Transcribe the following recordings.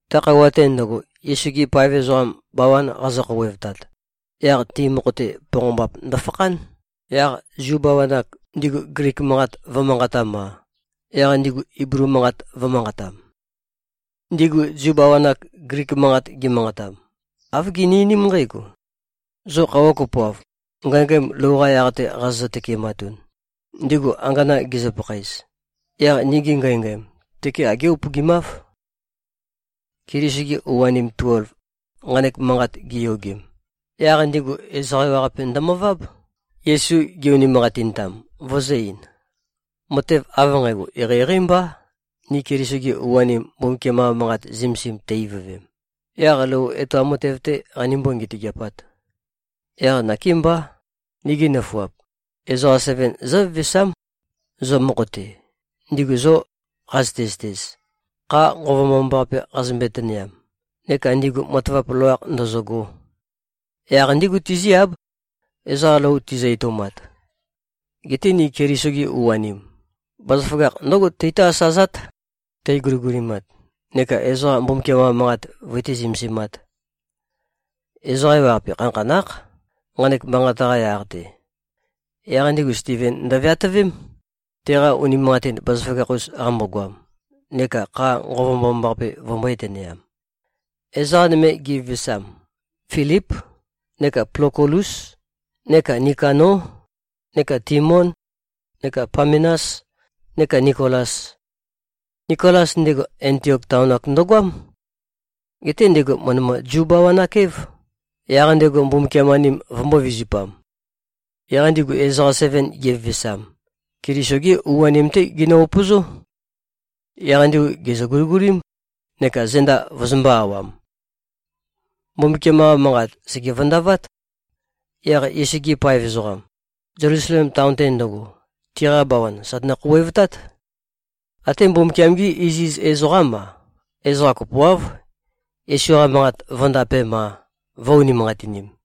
Ta khøuwa-te ndøgo, Yesu-gi paev ezoqam, bawan qazø-khouwevtat, yaq ti mokho-te ponqombap ndøfakhán, yaq Zu bawan-ak, ndigu Glik manqat vǿmanqatām-a, yaq ndigu, Iblu manqat vø̄manqatam. Ndigu Zu bawan-ak, Glik manqat gimanqatam, āv gini-einím nqǽgo, “Zo khøuwa kopoav, ngængæm lou-qa yaq-te qazozø-tøkematun, ndigu angana gizø-pakhaez, yaq nigi ngængæm tøke agé upøgimáv.” Keliso-gi u-anim tuelv, nqanek manqat giyogem, yaq ndigu ezoqa ewaqape ndømøváb, Yesu gi-unimanqatintam, vøzø̄-ein, “Matev av nqægo, eqeieqeí mbá, ni Keliso-gi u-anim, Mbumbukiam-qa Manqat zømesim tei-ivøvem, yaq lou etoam matev-tē qanimbō-ngetøgeapāt. Yaq nakémbá, nigi nøfuap, ezoqa seven zóvevesám, zo mokho-te, ndigu zo qazøte-zøtez, kha Nqova Mbomambaqapē qazømbe-tønøyām, neka ndigu matavap loloakh ndø̄zø̄gō. Yaq ndígu tizí-áb, ezoqa lou tizø-etoumat. Geté ni Keliso-gi u-anim, bazaføgakh ndǿgo teitǿ-asazát, teiguligulimat neka ezoqa Mbumbukiam-qa Manqat vøtí-zømesimāt.” Ezoqa ewaqape khanakhanákh, nqanek manqat-qa yaq-te. Yaq ndigu Stiven ndøveatøvém, teqa unimanqatin bazaføgakh-us qambogoam neka kha Nqova Mbomambaqape vømbø̄e-tønøyam. Ezoqa nøme givevesam, Filíp neka Plokolús neka Nikanó neka Timón neka Pamenás neka Nikolās. Nikolas, ndego Antiok taon-ak ndøgoám. Geté ndego mø̀ndømø-Zu-bawan-ak-év, yaq ndego Mbumbukiam-anim vømbō-vizupam. Yaq ndigu ezoqa seven, givevesam, Keliso-gi u-anim-té ginø-upøzó. Yaq ndigu gèzø-guligulím, neka zenda vøzømbø̄-awam. Mbumbukiam-qa Manqat sège-vøndavát. Yaq Yesu-gi paev ezoqam, Zelusalem taon-te ndøgo, tiqa bawan sà tønø-khouwevtát. Até Mbumbukiam-gí iziz ezoqám-a, ezoqa kopoáv, Yesu-qa manqat vø̄ndapem-a, vø̄-unimanqatinim.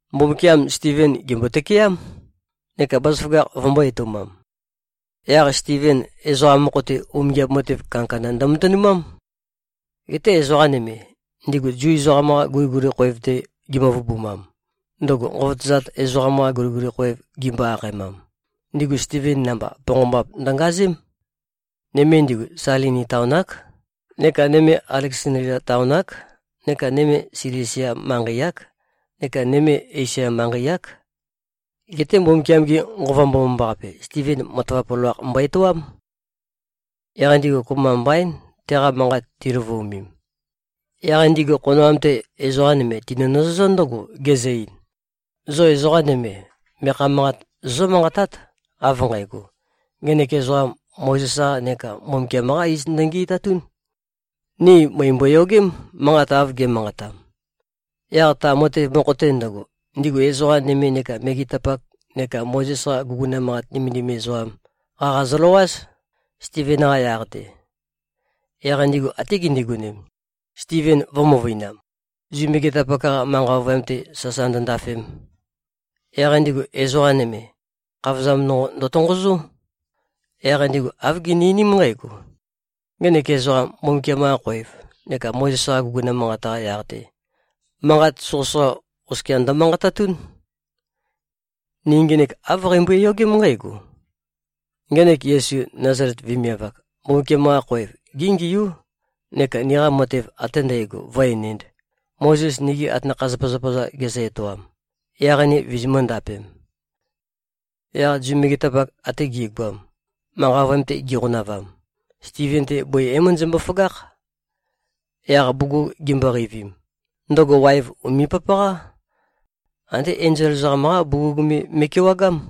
Mbumbukiam Stiven gèmbo-tøkeám neka bazaføgakh vømbō-etoumam. Yaq Stiven, ezoqa mokho-te, umingiap matev kandakanda ndømatønumám. Geté ezoqa nøme, ndigu Zu ezoqam-qa guliguli khoev-te gimøvøbumam, ndøgo Nqovotøzat Ezoqam-qa Guliguli Khoev gimbo-akhaemam, ndigu Stiven namba, ponqombap ndøngazém. Nøme ndigu Sailini taon-ák neka nøme Aleksandlia taon-ák neka nøme Silisia manqei-ák neka nøme Esia manqei-ák. Geté Mbumbukiam-ge Nqova Mbomambaqape, Stiven matavap loloakh mbo-etoám. Yaq ndigu kopømba mbaín, teqa manqat tiløvumem. Yaq ndigu khonoam-te, ezoqa nøme tìnø-nøzøzó ndǿgo, gizø-ein, “Zo ezoqa nøme, meakha manqat zómanqatát, av nqægo, ‘Ngenek ezoqam, Mozes-qá neka Mbumbukiam-qá iz ndøngi꞉tatún. Ni mø̀imbo-yogém, manqat av ge꞉manqatam.’” Yaq ta matev mokho-te ndøgo, ndigu ezoqa nøme neka megetapak neka Mozes-qa guguna manqat nømendim ezoqam, qaqa zøløwáz, Stiven-qa yaq-te. Yaq ndigu até gindigonem, Stiven vø̄-møvøinam, Zu megetapak-qa manqa ovøyam-te sasa ndøndafem. Yaq ndigu, ezoqa nøme, khavozam nonqo ndøtonqozó. Yaq ndigu āv gini-einím nqǽgo, “Ngenek ezoqam, Mbumbukiam-qa khoev neka Mozes-qa guguna manqat-qa yaq-te, manqat soqøsoqa oskia ndømanqatatún. Ni ngenek āv qeimbøe-yogém nqǽgo, ‘Ngenek Yesu, Nazalet vemiav-ak, Mbumbukiam-qa khoev géngiú neka niqa matev ate ndægo vǿ-enēnd, Mozes nigi atanakha-zapazapa-za gezø-etoam, yaq ni vizimø̄-ndapem.’” Yaq Zu megetapak ate gi꞉goam, manqa ovøyam-te giqonavam, Stiven-te bøi é-møndøzømbo-føgákh. Yaq bugug gimbo-qeivim, ndøgo waev ùnime꞉-papaqá. Andé enzol ezoqam-qá bugug me me꞉kewagám.